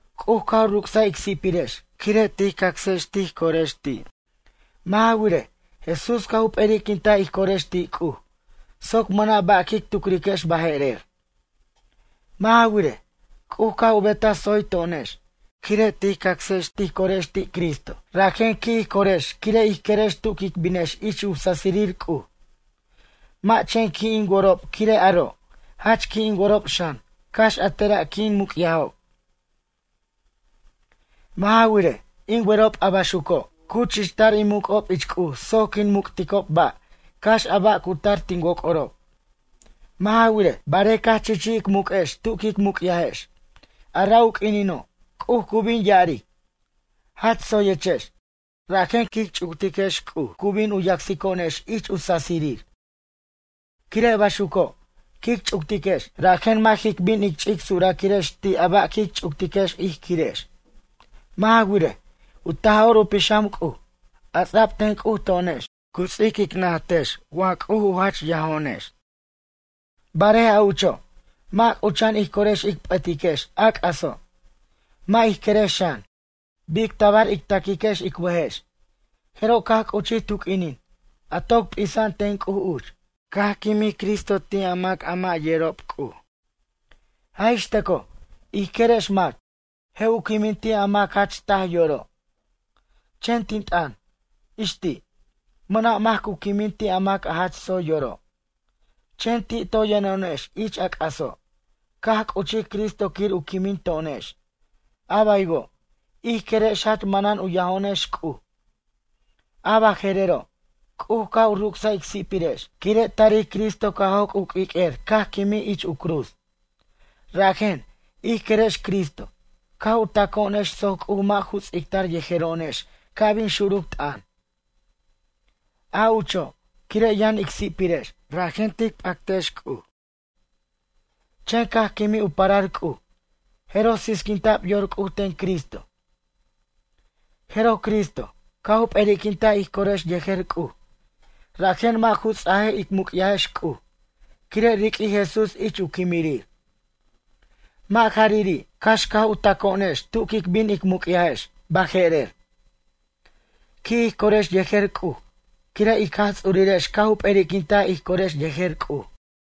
C'uj caj u ruc'saj ic si'pirex, quire' tij cacsex tij corex ti'. Mʌ' ja wirej, Jesús caj u p'eri'quintaj ij corex ti' C'uj, soc mʌna' ba' quic tucriquex baje'rer. Mʌ' ja wirej, C'uj caj u betaj tsoy to'onex, quire' tij cacsex tij corex ti' Cristo. Rajen qui' ij corex quire' ij querex tu quic binex ich u sasirir C'uj. Mʌ' chen qui' in worob quire' aro', jach qui' in worob xan, cax a tera' quin muc'yajob. Mʌ' ja wirej, in werob a baxuco', cu chichtar in muc'ob ich C'uj soc quin muc'ticob ba', cax a ba' cu tar tin woc'orob. Mʌ' ja wirej, barej caj chichij ic muq'u'ex tu quic muc'yajex, a ra' u q'uinino', C'uj cu bin ya'aric: “Jach tsoyechex”, rajen quic ch'uctiquex C'uj cu bin u yacsico'onex ich u sasirir. Quire' baxuco', quic ch'uctiquex, rajen mʌ' jic bin ic ch'ic suraquirex ti' a ba' quic ch'uctiquex ij quirex. Mʌ' ja wirej, u Taj'or u Pixam C'uj, a ts'a'b ten C'uj to'onex, cu ts'ic ic najtex wa C'uj u jach yajo'onex. Barej a ucho', mʌ' c'ucha'an ij corex ic p'ʌtiquex a c'aso', mʌ' ij querex xan, bic tabar ic taquiquex ic bʌjex, jeroj caj c'uchij tu q'uinin, a toc p'isa'an ten C'uj uch, caj quimij Cristo ti' a mac a mʌ' yerob C'uj. Jaj ix tʌcoj, ij querex mac, je' u quimin ti' a mac jach taj yoro'. Chen tin t'ʌn, ix ti', mʌna' mac cu quimin ti' a mac a jach tsoy yoro'. Chen ti' toy yʌno'onex ich a c'aso', caj c'uchij Cristo quir u quimin to'onex, a baywo', ij querex jach manan u yajo'onex C'uj. A baje'rero', C'uj caj u ruc'saj ic si'pirex, quire' tarij Cristo caj joc' u q'uiq'uer caj quimij ich u cruz. Rajen, ij querex Cristo, caj u taco'onex soc C'uj mʌ' ju ts'ictar yejero'onex ca' bin xuruc t'ʌn. A ucho', quire' yʌn ic si'pirex, rajen tic p'actex C'uj. Chen caj quimij u parar C'uj, jeroj sisquinta'b yor C'uj ten Cristo. Jeroj Cristo, caj u p'eri'quintaj ij corex yejer C'uj, rajen mʌ' ju ts'ajej ic muc'yajex C'uj, quire' riq'uij Jesús ich u quimirir. Mʌ' jariri', cax caj u taco'onex tu quic bin ic muc'yajex, baje'rer, qui' ij corex yejer C'uj, quire' ic Jaj Ts'urirex caj u p'eri'quintaj ij corex yejer C'uj.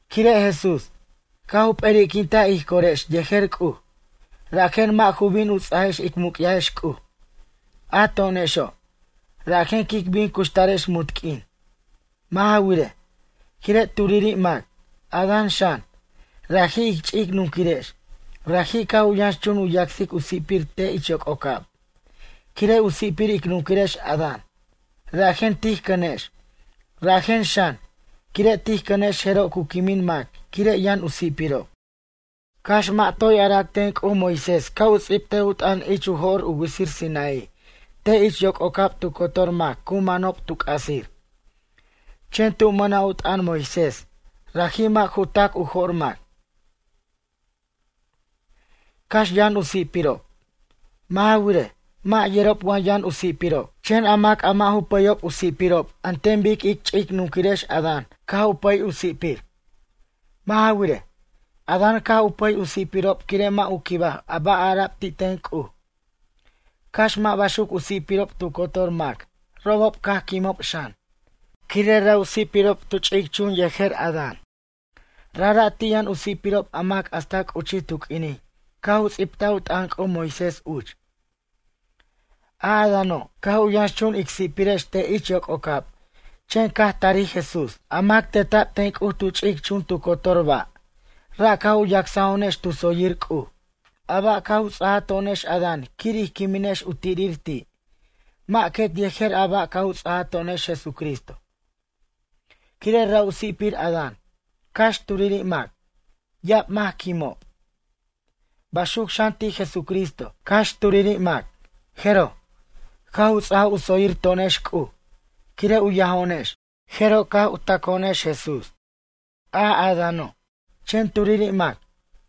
Quire' Jesús, caj u p'eri'quintaj ij corex yejer C'uj, rajen mʌ' ju bin u ts'ajex ic muc'yajex C'uj, a to'onexo', rajen quic bin cuxtarex munt q'uin. Mʌ' ja wirej, quire' turiri' mac, Adán xan, raji' ic ch'ic nunquirex, raji' caj u yʌnxchun u yacsic u si'pir te' ich yoc'ocab. Quire' u si'pir ic nunquirex Adán, rajen tij cʌnex, rajen xan, quire' tij cʌnex jeroj cu quimin mac quire' yʌn u si'pirob. Cax mʌ' toy ara'ac ten C'uj Moisés ca' u ts'ibtej u t'ʌn ich u jo'r u witsir Sinaí, te' ich yoc'ocab tu cotor mac cu manob tu c'asir. Chen tu mʌna' u t'ʌn Moisés, raji' mʌ' ju tac u jo'r mac, cax yʌn u si'pirob. Mʌ' ja wirej, mʌ' yerob wa yʌn u si'pirob. Chen a mac a mʌ' ju pʌyob u si'pirob an ten bic ic ch'ic nunquirex Adán caj u pʌy u si'pir. Mʌ' ja wirej, Adán caj u pʌy u si'pirob quire' mʌ' u quibaj a ba' ara'b ti' ten C'uj. Cax mʌ' baxuc u si'pirob tu cotor mac, robob caj quimob xan, quire' ra' u si'pirob tu ch'ic chun yejer Adán. Rajra' ti' yʌn u si'pirob a mac hasta c'uchij tu q'uinin caj u ts'ibtaj u t'ʌn C'uj Moisés uch. A Adáno', caj u yʌnxchun ic si'pirex te' ich yoc'ocab, chen caj tarij Jesús, a mac teta'b ten C'uj tu ch'ic chun tu cotor ba', ra' caj u yacso'onex tu tsoyir C'uj. A ba' caj u ts'aja to'onex Adán quir ij quiminex u tirir ti', mʌ' quet yejer a ba' caj u ts'aja to'onex Jesúcristo. Quire' ra' u si'pir Adán, cax turiri' mac, ya'ab mac caj quimob. Baxuc xan ti' Jesucristo, cax turiri' mac, jeroj, caj u ts'a u tsoyir to'onex C'uj, quire' u yajo'onex, jeroj caj taco'onex Jesús. A Adáno', chen turiri' mac,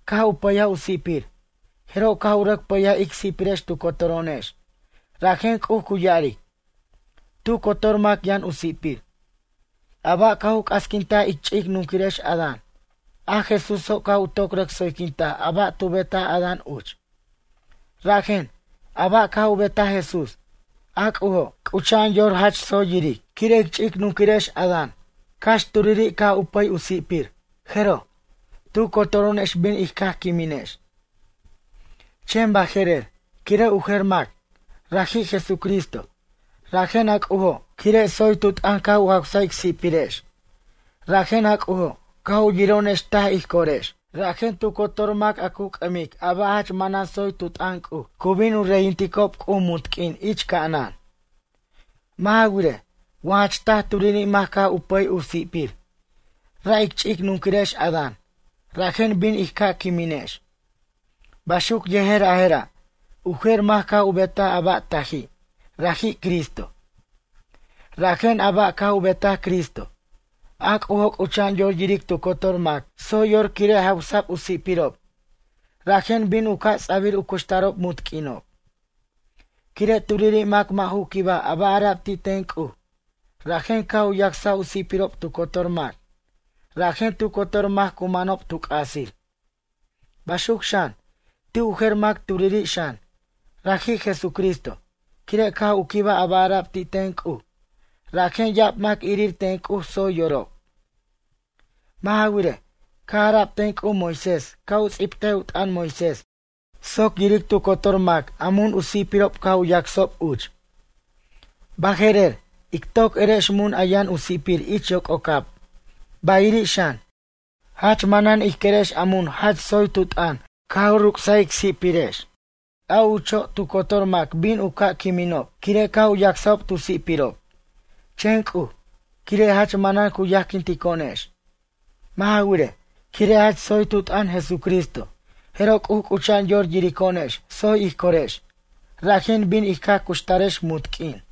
caj u pʌyaj u si'pir, jeroj caj u rʌc pʌyaj ic si'pirex tu cotoro'onex, rajen C'uj cu ya'aric: “Tu cotor mac yʌn u si'pir.” A ba' caj u c'asquintaj ic ch'ic nunquirex Adan, a Jesúso' caj u toc rʌc tsoyquintaj a ba' tu betaj Adán uch. Rajen, a ba' caj u betaj Jesús, a C'ujo', c'ucha'an yor jach tsoy yiric. Quire' ic ch'ic nunquirex Adán, cax turiri' caj u pʌy u si'pir, jeroj, tu cotoro'onex bin in caj quiminex. Chen baje'rer, quire' u jer mac, raji' Jesucristo, rajen a C'ujo', quire' tsoy tu t'ʌn caj u jaws ic si'pirex. Rajen a C'ujo', caj u yiro'onex taj ij corex. Rajen tu cotor mac a cu c'ʌmic a ba' jach manan tsoy tu t'ʌn C'uj cu bin u reyinticob C'uj munt q'uin ich ca'anan. Mʌ' ja wirej, wa jach taj turiri' mac caj u pʌy u si'pir, ra' ic ch'ic nunquirex Adán, rajen bin in caj quiminex. Baxuc yejer a jera', u jer mac caj u betaj a ba' taji', raji' Cristo. Rajen a ba' caj u betaj Cristo, a C'ujo' c'ucha'an yor yiric tu cotor mac tsoy yor quire' jawsa'b u si'pirob, rajen bin u ca' ts'a'bir u cuxtarob munt q'uinob. Quire' turiri' mac mʌ' ju quibaj a ba' ara'b ti' ten C'uj, rajen caj u yacsaj u si'pirob tu cotor mac, rajen tu cotor mac cu manob tu c'asir. Baxuc xan, ti' u jer mac turiri' xan, raji' Jesucristo, quire' caj u quibaj a ba' ara'b ti' ten C'uj, rajen ya'ab mac irir ten C'uj tsoy yorob. Mʌ' ja wirej, caj ara'b ten C'uj Moisés ca' u ts'ibtej u t'ʌn Moisés soc yiric tu cotor mac mun u si'pirob caj u yacsob uch. Baje'rer, ic toc erex mun a yʌn u sipir ich yoc'ocab, bayiri' xan, jach manan ij querex a mun jach tsoy tu t'ʌn caj u ruc's ic si'pirex. A ucho', tu cotor mac bin u ca' quiminob, quire' caj u yacsob tu sipirob. Chen C'uj, quire' jach manan cu yajquintico'onex. Mʌ' ja wirej, quire' jach tsoy tu t'ʌn Jesucristo, jeroj C'uj c'ucha'an yor yirico'onex tsoy ij corex, rajen bin in caj cuxtarex munt q'uin.